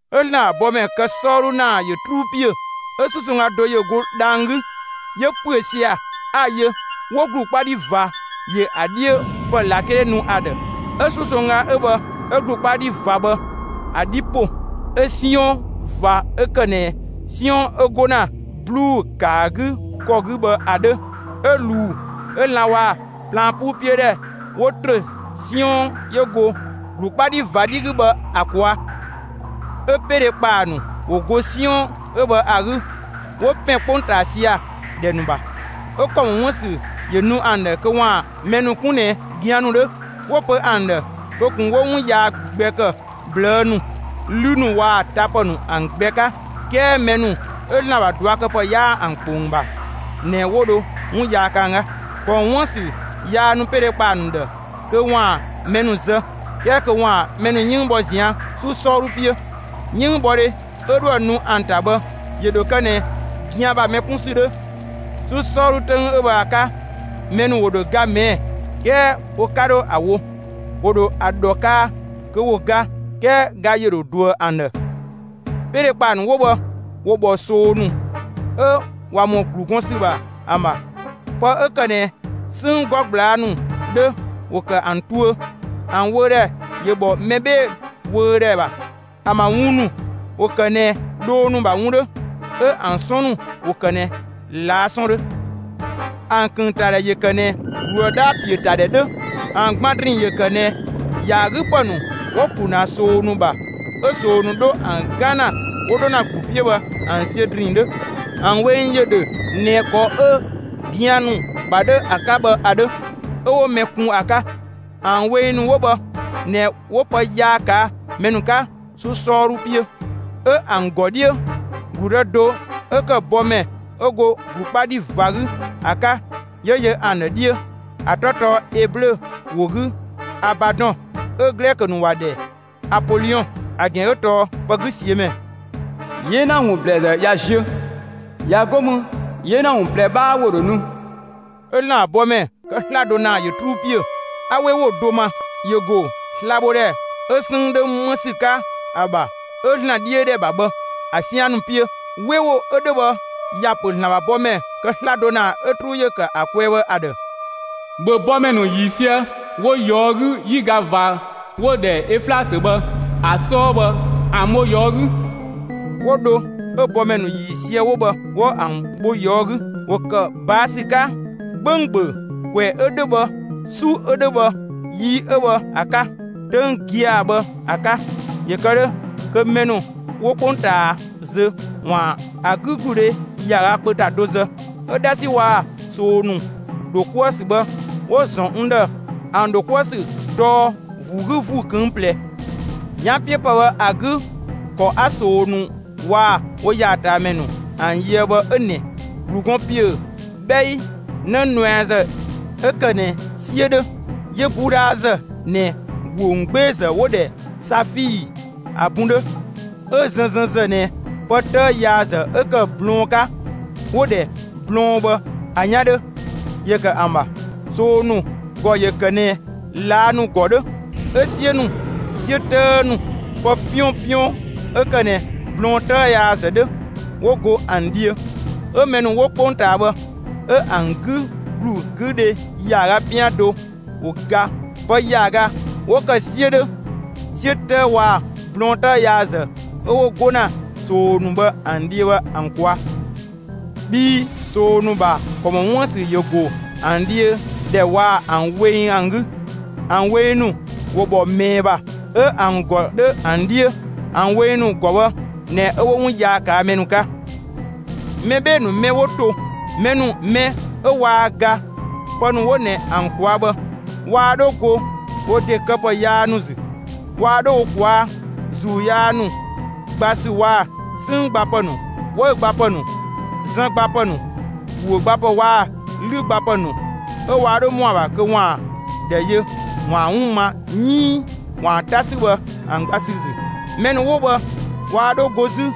'Ö ‑Zlan ‑bha bɔmɛ kë 'sɔɔdhu ‑naa ‑yö 'truu ‑piö. 'Ö 'susongga do ‑yö go dhang‑ 'gü, 'yö ‑püö sia‑; 'a‑ yö; 'wo ‑glu 'kpa 'dhi ꞊va ‑yö ‑a 'dhiö ‑pë ꞊lakele nu ‑a ‑dhë. 'Ö 'susongga 'ö bhë 'ö ‑glu 'kpa 'dhi ꞊va bhë ‑a 'dhi ‑po, 'ö 'siɔn ꞊va 'ö ‑kë ꞊nɛ 'siɔn 'ö 'go ‑na ꞊bluu'‑ ‑kë ‑a 'gü ‑kɔ 'gü bhë ‑a 'dhö 'ö ꞊luu 'ö lan‑ waa‑ plaan 'puu 'piö ‑dhɛ ‑wo ‑trö 'siɔn 'yö go ‑glu 'kpa 'dhi ꞊va 'dhi 'gü bhë ‑a ꞊kwaa'. 'Ö 'peedhekpaa ‑nu ‑wo go 'siɔn 'ö bhë ‑a 'gü 'wo ‑pɛn 'kpongtaa sia‑ ‑dhɛ ‑nu ‑bha; 'ö ‑kɔ ‑mɔ 'wuën‑ ‑sü ‑yö nu ‑an ‑dhë kö ‑waan mɛ ‑nu 'kun ꞊nɛ gian ‑nu 'dhö. 'Wo‑ pö ‑an ‑dhë kö ꞊kun 'wo 'wun yaa gbɛ ‑kë ꞊blëë' ‑nu, 'lü ‑nu waa‑ tapë ‑nu ‑an gbɛ 'ka; 'kɛɛ mɛ ‑nu 'ö ‑Zlan ‑bha ꞊duakëpë 'yaa ‑an ‑kpong ‑bha ꞊nɛ 'wo dho 'wun yaa kë ‑an 'ka. ‑Kɔ ‑mɔ 'wuën‑ ‑sü yaa nu 'peedhekpaa ‑nu ‑dhë kö ‑waan mɛ ‑nu zë, 'kɛɛ kö ‑waan mɛ ‑nu 'yënng bhɔ ꞊zian' 'su 'sɔɔdhu 'piö. 'Yënngbhɔdhe 'ö 'dhoë‑ nu ‑an ‑ta bhë, ‑yö ‑dho kë ꞊nɛ gian ‑bha mɛ 'kun ‑sü 'dhö. 'Su 'sɔɔdhu 'töng 'ö bhë ‑a 'ka, mɛ ‑nu ‑wo ‑dho ga ꞊mɛɛ'‑, 'kɛɛ wo 'ka 'dho ‑a wo; ‑wo ‑dho ‑a ‑dhɔ kaa kö 'wo ga, 'kɛɛ ga ‑yö ‑dho ꞊duëë ‑an ‑dhë. 'Peedhekpaa ‑nu 'wo bhë ‑wo ‑bhɔ ꞊soo ‑nu 'ö ꞊wa ‑mɔ ‑glu gɔn ‑sü ‑bha ‑an ‑bha. Pë 'ö ‑kë ꞊nɛ 'sënng 'gɔ ꞊gblaa' ‑nu 'dhö ‑wo ‑kë ‑an tuö; ‑an wöödhɛ ‑yö ‑bhɔ mɛ 'bhee‑ wöödhɛ ‑bha. ‑An ‑bha wun ‑nu ‑wo ‑kë ꞊nɛ dhoo ‑nu ‑bha wun 'dhö, 'ö ‑an 'sɔn ‑nu ‑wo ‑kë ꞊nɛ ꞊laa' 'sɔn 'dhö. ‑An ‑kënngtadhɛ ‑yö ‑kë ꞊nɛ ‑gluë 'dhaa‑ ‑piö ‑ta ‑dhɛ 'dhö; ‑an gban ‑drinng ‑yö ‑kë ꞊nɛ ‑yaagüpë ‑nu 'wo‑ ‑klu ‑na ꞊soo ‑nu ‑bha, 'ö ꞊soo ‑nu 'dho ‑an 'gan ‑na 'wo 'dho ‑na ‑glu 'piö bhë ‑an ziö ‑drinng 'dhö. ‑An weng ‑yö ‑dhö ꞊nɛ ‑kɔ 'ö gian ‑nu ‑bha 'dhö ‑a 'ka bhë ‑a 'dhö, 'ö 'wo mɛ kun ‑a 'ka. ‑An weng ‑nu 'wo bhë ꞊nɛ 'wo pë yaa ꞊kaa' mɛ ‑nu 'ka 'su 'sɔɔdhu 'piö. 'Ö ‑an ‑gɔ 'dhiö, ‑gludë do 'ö ‑kë bɔmɛ 'ö go ‑glu 'kpa 'dhi ꞊va 'gü ‑a 'ka, ‑yö yö ‑an ‑dhë 'dhiö. ‑A 'tɔ tɔɔ Eblö ‑wo 'gü Abadɔn, 'ö Glɛkö ‑nu ‑wa ‑dhɛ Apoliɔn, (‑a ‑gɛn 'ö tɔɔ «Pëgüsiömɛ»). 'Yena ‑wun ‑blɛɛzë ꞊ya ziö, ꞊ya 'go mü 'yena ‑wun ꞊plɛ 'bhaa ‑wo ‑dho nu. 'Ö ‑Zlan ‑bha bɔmɛ kë 'slado ‑naa ‑yö 'truu ‑piö. 'A 'we ‑wo do ma; ‑yö ‑go slabhodhɛ 'ö 'sënng 'dhö 'më ‑sü 'ka ‑a ‑bha 'ö ‑Zlan 'dhiö ‑dhɛ ‑bha bhë ‑a 'sian ‑nu 'piö. 'We ‑wo 'ö 'dhö bhë, ‑ya ‑pö ‑Zlan ‑bha bɔmɛ kë 'slado ‑naa 'ö 'truu ‑yö ‑kë ‑a kwɛɛ bhë ‑a ‑dhë: «‑Bhö bɔmɛ ‑nu ‑yiisië 'wo ꞊yɔɔ' 'gü 'yiga ꞊va 'wo‑ ‑dhɛ öflatö bhë ‑a 'sɔɔ bhë ‑an bho ꞊yɔɔ' 'gü.» 'Wo dho 'ö bɔmɛ ‑nu ‑yiisië 'wo bhë 'wo ‑an bho ꞊yɔɔ' 'gü. ‑Wo ‑kë ꞊baa' ‑sü 'ka 'gbönggböng ‑kwɛ 'ö 'dhö bhë, 'su 'ö 'dhö bhë, yi 'ö bhë ‑a 'ka, 'töng gia‑ bhë ‑a 'ka ‑yö kë 'dhö kö mɛ ‑nu 'wo 'kpongtaa zö, ‑waan ‑a 'gügludhe ‑yaaga kpö ‑ta do zë. 'Ö 'dhasi waa‑ ꞊soo ‑nu ‑dho 'kuë‑ ‑sü bhë 'wo‑ ‑zɔn n ‑dhë. ‑An ‑dho 'kuë‑ ‑sü tɔɔ ‑vuu 'gü ‑vuu ꞊këng' ꞊plɛ. 'Yanpiöpë bhë ‑a 'gü, ‑kɔ 'a ꞊soo ‑nu waa‑ wo ‑yaataamɛ ‑nu ‑an yöë bhë 'ö ꞊nɛ: ‑Glu gɔn ‑piö 'bhɛi 'në nuɛazë 'ö ‑kë ꞊nɛ 'siö 'dhö, 'yö 'budhazë ꞊nɛ ‑guö ‑wungbeezë 'wo‑ ‑dhɛ safii ‑a bun 'dhö, 'ö zënzënzë ꞊nɛ pë 'tëë yaazë 'ö ‑kë blɔɔn 'ka 'wo‑ ‑dhɛ blɔɔn bhë ‑a 'yan 'dhö ‑yö ‑kë ‑an ‑bha. ꞊Soo ‑nu ‑gɔ ‑yö ‑kë ꞊nɛ ꞊laa' ‑nu ‑gɔ 'dhö. 'Ö 'siö ‑nu, 'siö 'tëë ‑nu, pë 'piɔnpiɔn 'ö ‑kë ꞊nɛ blɔɔn 'tëë yaazë 'dhö ‑wo go ‑an dhiö. 'Ö mɛ ‑nu 'wo 'kpongtaa bhë 'ö ‑an 'gü ‑glu 'gü dhe ‑yaaga 'pian do ‑wo ga pë ‑yaaga 'wo ‑kë 'siö 'dhö, 'siö 'tëë waa‑ blɔɔn 'tëë yaazë 'ö 'wo 'go ‑na ꞊soo ‑nu bhë ‑an dhiö bhë ‑an ꞊kwaa'. Bhii ꞊soo ‑nu ‑bha ‑kɔ ‑mɔ 'wuën‑ ‑sü ‑yö ‑go ‑an dhiö ‑dhɛ, waa‑ ‑an weng ‑an 'gü. ‑An weng ‑nu ‑wo ‑bhɔ ꞊mɛɛ ‑bha, 'ö ‑an ‑gɔ 'dhö ‑an 'dhiö; ‑an weng ‑nu ‑gɔ bhë ꞊nɛ 'ö 'wo 'wun yaa ꞊kaa' mɛ ‑nu 'ka. Mɛ 'bhee‑ ‑nu mɛ 'wo to, mɛ ‑nu mɛ 'ö waa ga pë ‑nu 'wo ꞊nɛ ‑an ꞊kwaa' bhë, waa 'dho go wo ‑de këpë yaa ‑nu ‑zü. Waa 'dho wo ꞊kwaa' ‑zuu yaa ‑nu gba ‑sü waa‑ 'sënng gbapë nu, 'wëü‑ gbapë ‑nu, zën gbapë ‑nu, ‑guö gbapë waa‑ 'lü gbapë ‑nu, 'ö waa 'dho ‑mɔ ‑a ‑bha kö ‑waan ‑dhɛ yö ‑waan 'wun ma 'iin ‑waan 'ta 'sü bhë ‑an gba ‑sü ‑zü. Mɛ ‑nu 'wo bhë waa 'dho go 'zü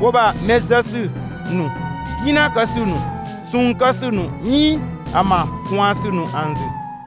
wo ‑bha mɛ zë ‑sü ‑nu, 'gina kë ‑sü ‑nu, ꞊sɔɔn kë ‑sü ‑nu 'iin ‑an ‑bha ꞊kwaan ‑sü ‑nu ‑an ‑zü.